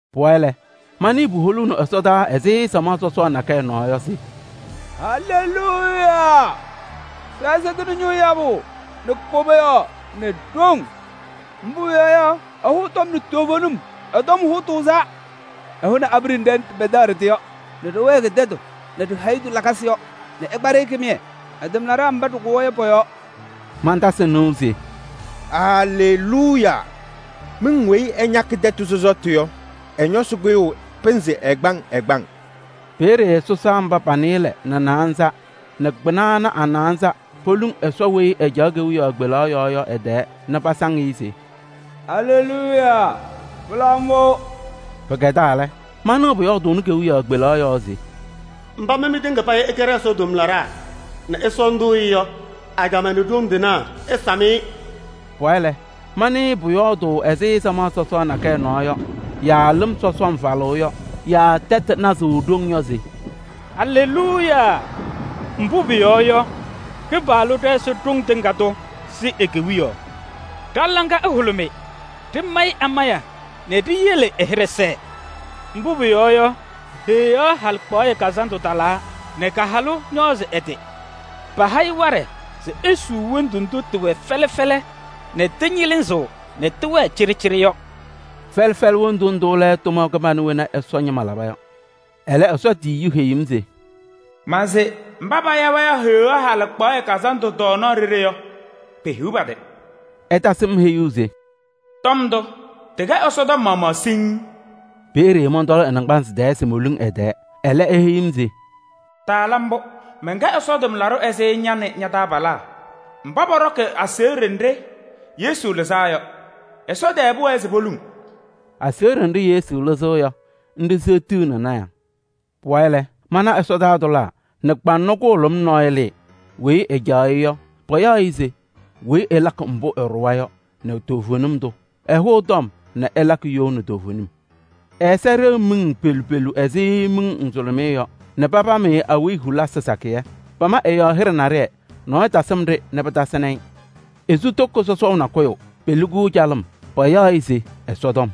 Pʋwayɩ lɛ, manɩɩ puholuuni ɛsɔdaa ɛzɩ samaɣ sɔsɔɔ nakɛyɛ nɔɔ yɔ se: “Aleluuya! Ɖɛ-Ɛsɔ tɩnɩ ñʋʋ yabʋ nɛ koboyaɣ nɛ ɖoŋ! Mbʋ pʋyɔɔ yɔ, ɛhʋʋ tɔm nɛ toovenim, ɛ-tɔm hʋʋ tʋʋzaa. Ɛhʋnɩ abiɖe nɖɩ ɖɩpɛdaɣ ɖɩ-tɩ nɛ ɖɩwɛɛkɩ tɛtʋ nɛ ɖi-hayitu lakasɩ yɔ nɛ ɛkpa-ɖɩ kɩmɩyɛ ɛ-tʋmlaɖaa mba ɖɩkʋwa yɔ pɔ-yɔɔ.” Mantasɩ nɩʋ se: “Aleluuya! Miŋ weyi ɛñakɩ tɛtʋ sɔsɔtʋ yɔ, ɛ-ñɔsɩ kʋyʋʋ pɩnzɩ ɛgbaŋ ɛgbaŋ.” Peeye sɔsaa mba pa-nɩɩlɛ nɛ naanza nɛ kpɩna ana a-naanza poluŋ Ɛsɔ weyi ɛcaɣ kewiyaɣ kpelaɣ yɔɔ yɔ ɛ-tɛɛ nɛ pasaŋ-ɩ se: “Aleluuya! Pɩla mbʋ!” Pɩkɛdaa lɛ, manɩɣ pʋyɔɔdʋʋnɩ kewiyaɣ kpelaɣ yɔɔ se: “Mba mɩ mɩtɩŋa payɩ ɩkɛ ɖɛ-Ɛsɔ tʋmlaɖaa nɛ ɩsɔɔndʋʋ-ɩ yɔ, ajamaa nɛ ɖoŋ tɩnaa ɩsam-ɩ!” Pʋwayɩ lɛ, manɩɩ pʋyɔɔdʋʋ ɛzɩ samaɣ sɔsɔɔ nakɛyɛ nɔɔ yɔ yaa lɩm sɔsɔm falʋʋ yɔ yaa tɛʋ nazʋʋ ɖoŋ yɔ se: “Aleluuya! Mbʋ pʋyɔɔ yɔ, Kɩpaɣlʋ ɖɛ-Ɛsɔ Ɖoŋ Tɩŋa Tʋ sɩ e-Kewiyaɣ. Ɖa-laŋa ɛhʋlʋmɩ, ɖɩmayɩ amaya nɛ ɖiyele ɛ-hɩɖɛ sɛɛ. Mbʋ pʋyɔɔ yɔ, Heɣa halɩkpaɣyɛ kazandʋ talaa nɛ ka-halʋ ñɔɔzɩ ɛ-tɩ. Paha-ɩ waɖɛ se esuu wondu ndʋ tɩwɛ fɛlɛ fɛlɛ nɛ tɩñɩlɩzɩɣ nɛ tɩwɛɛ cɩɖɩcɩɖɩ yɔ.” Fɛlɛ fɛlɛ wondu ndʋ lɛ tʋma kɩbana wena Ɛsɔ ñɩma laba yɔ. Ɛlɛ Ɛsɔ tiyiyu heyi-m se: “Ma se: mba paya-wɛ Heɣa halɩkpaɣyɛ kazandʋ tɔɔnaɣ ɖeɖe yɔ, pehiɣ pa-tɩ!” Ɛtasɩ-m heyuu se: “Tɔm ndʋ, tɩkɛ Ɛsɔ tɔm maɣmaɣ siŋŋ.” Peeye mɔntɔlɩ ɛ-naŋgbanzɩ tɛɛ se moluŋ ɛ-tɛɛ. Ɛlɛ, eheyi-m se: “Taala mbʋ! Mɛnkɛ Ɛsɔ tʋmlaɖʋ ɛzɩ ña nɛ ña-taabalaa mba pɔɖɔkɩ aseɣɖe nɖɩ Yesu lɩzaa yɔ. Ɛsɔ tɛɛ pʋwɛɛ se ŋluŋ!” Aseɣɖe nɖɩ Yesu lɩzɩɣ yɔ, nɖɩ seɣtiɣni lɔɔyɩsɩ tɩnaa. Pʋwayɩ lɛ, mana ɛsɔdaa tʋlaa nɛ kpaŋnɔ kʋhʋlʋm nɔɔyʋ lɩɩ. Weyi ɛcaɣ-ɩ yɔ, payaɣ-ɩ se Weyi Ɛlakɩ Mbʋ Ɛɖʋwa yɔ nɛ Toovenim Tʋ. Ɛhʋʋ tɔm nɛ ɛlakɩ you nɛ toovenim. Ɛ-ɛza ɖeɣ miŋ pelu pelu ɛzɩ miŋ nzʋlʋmɩyɛ yɔ nɛ papam-ɩ awiya hulisi sakɩyɛ. Pama ɛ-yɔɔ hɩɖɛ naɖɩyɛ, nɔɔyʋ tasɩm-ɖɩ nɛ pɩtasɩnɩ-ɩ. Esu toko sɔsɔʋ nakʋyʋ, peli-kʋ calɩm. Payaɣ-ɩ se: Ɛsɔtɔm.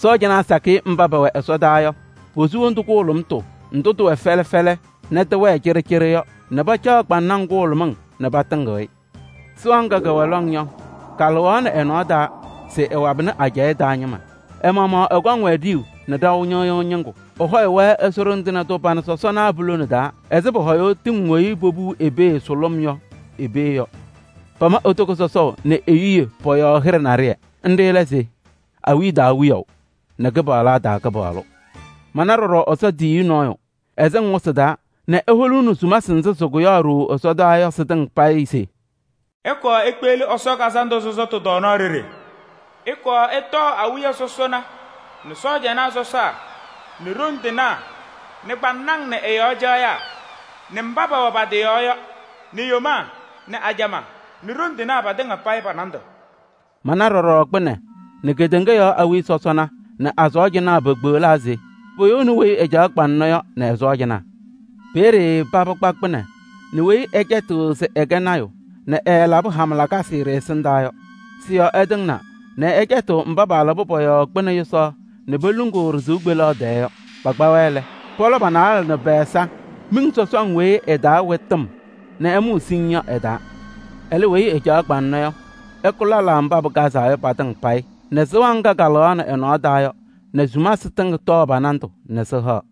Sɔɔjanaa sakɩyɛ mba pɛwɛ ɛsɔdaa yɔ, posu wondu kʋhʋlʋmʋtʋ ndʋ tɩwɛ fɛlɛ fɛlɛ nɛ tɩwɛɛ cɩɖɩcɩɖɩ yɔ nɛ pacaɣ kpaŋnaŋ kʋhʋlʋmɩŋ nɛ patɩŋɩɣ-ɩ. Sɩɣa ŋga kɛwɛ lɔŋ yɔ, kalɩɣaɣnɩ ɛ-nɔɔ taa se ɛwabɩnɩ ajɛɛ taa ñɩma. Ɛ-maɣmaɣ ɛkɔŋ-wɛ ɖiyuu nɛ ɖaʋ ñɩɣyʋʋ ñɩŋgʋ. Ɛhɔyʋʋ-wɛ Ɛsɔ Ɖoŋ Tɩŋa Tʋ pana sɔsɔna pulone taa ɛzɩ pɔhɔyʋʋ tɩŋ weyi popuu i-pee sʋlʋm yɔ i-pee yɔ. Pama e-toko sɔsɔʋ nɛ e-yuye pɔ-yɔɔ hɩɖɛ naɖɩyɛ. Nɖɩ lɛ se: awiya taa Wiyaʋ nɛ kɩpaɣlaa taa Kɩpaɣlʋ. Mana ɖɔɖɔ Ɛsɔ tiyiyu nɔɔyʋ, ɛsɩŋ wɩsɩ taa nɛ eholuuni sumasɩ nzɩ sɩkʋyaɣ ɖooo ɛsɔdaa yɔ sɩtɩŋa payɩ se: “Ɩkɔɔ ikpeɣli Ɛsɔ kazandʋ sɔsɔtʋ tɔɔnaɣ ɖeɖe! Ɩkɔɔ ɩtɔɔ awiya sɔsɔna nɛ sɔɔjanaa sɔsaa nɛ ɖoŋ tɩnaa nɛ kpaŋnaŋ nɛ ɩ-yɔɔ caɣyaa nɛ mba pɛwɛ pa-tɩ yɔɔ yɔ nɛ yomaa nɛ ajamaa nɛ ɖoŋ tɩnaa patɩŋa payɩ pa-nandʋ.” Mana ɖɔɖɔ kpɩnɛ nɛ kedeŋa yɔɔ awiya sɔsɔna nɛ a-sɔɔjanaa pekpeɣlaa se poyouni weyi ɛcaɣ kpaŋnɔ yɔ nɛ ɛ-sɔɔjanaa. Peeye paba kpa kpɩnɛ nɛ weyi ɛcɛtɩɣ se ɛkɛ lɔɔyaɣ tʋ nɛ ɛɛlabɩ hama lakasɩ ɖɩ-ɛsɩndaa yɔ. Sɩ-yɔɔ ɛtɩŋnaa nɛ ɛcɛtɩ mba paalabɩ pɔ-yɔɔ kpɩnɛ yʋsaɣ nɛ poluŋuu ɖɩ-sɩʋ kpeleɣ tɛɛ yɔ. Pakpa-wɛ lɛ, pɔlɔ pa-naalɛ nɛ pɛ-ɛza miŋ sɔsɔŋ weyi ɛ-taa wɛ tɩm nɛ ɛmʋʋ siŋŋ yɔ ɛ-taa. Ɛlɛ weyi ɛcaɣ kpaŋnɔ yɔ, ɛkʋ lɛlaa mba pɩkazaa yɔ patɩŋa payɩ nɛ sɩɣa ŋga kalɩɣaɣnɩ ɛ-nɔɔ taa yɔ nɛ sumasɩ tɩŋa tɔɔ pa-nandʋ nɛ sɩhaɣ.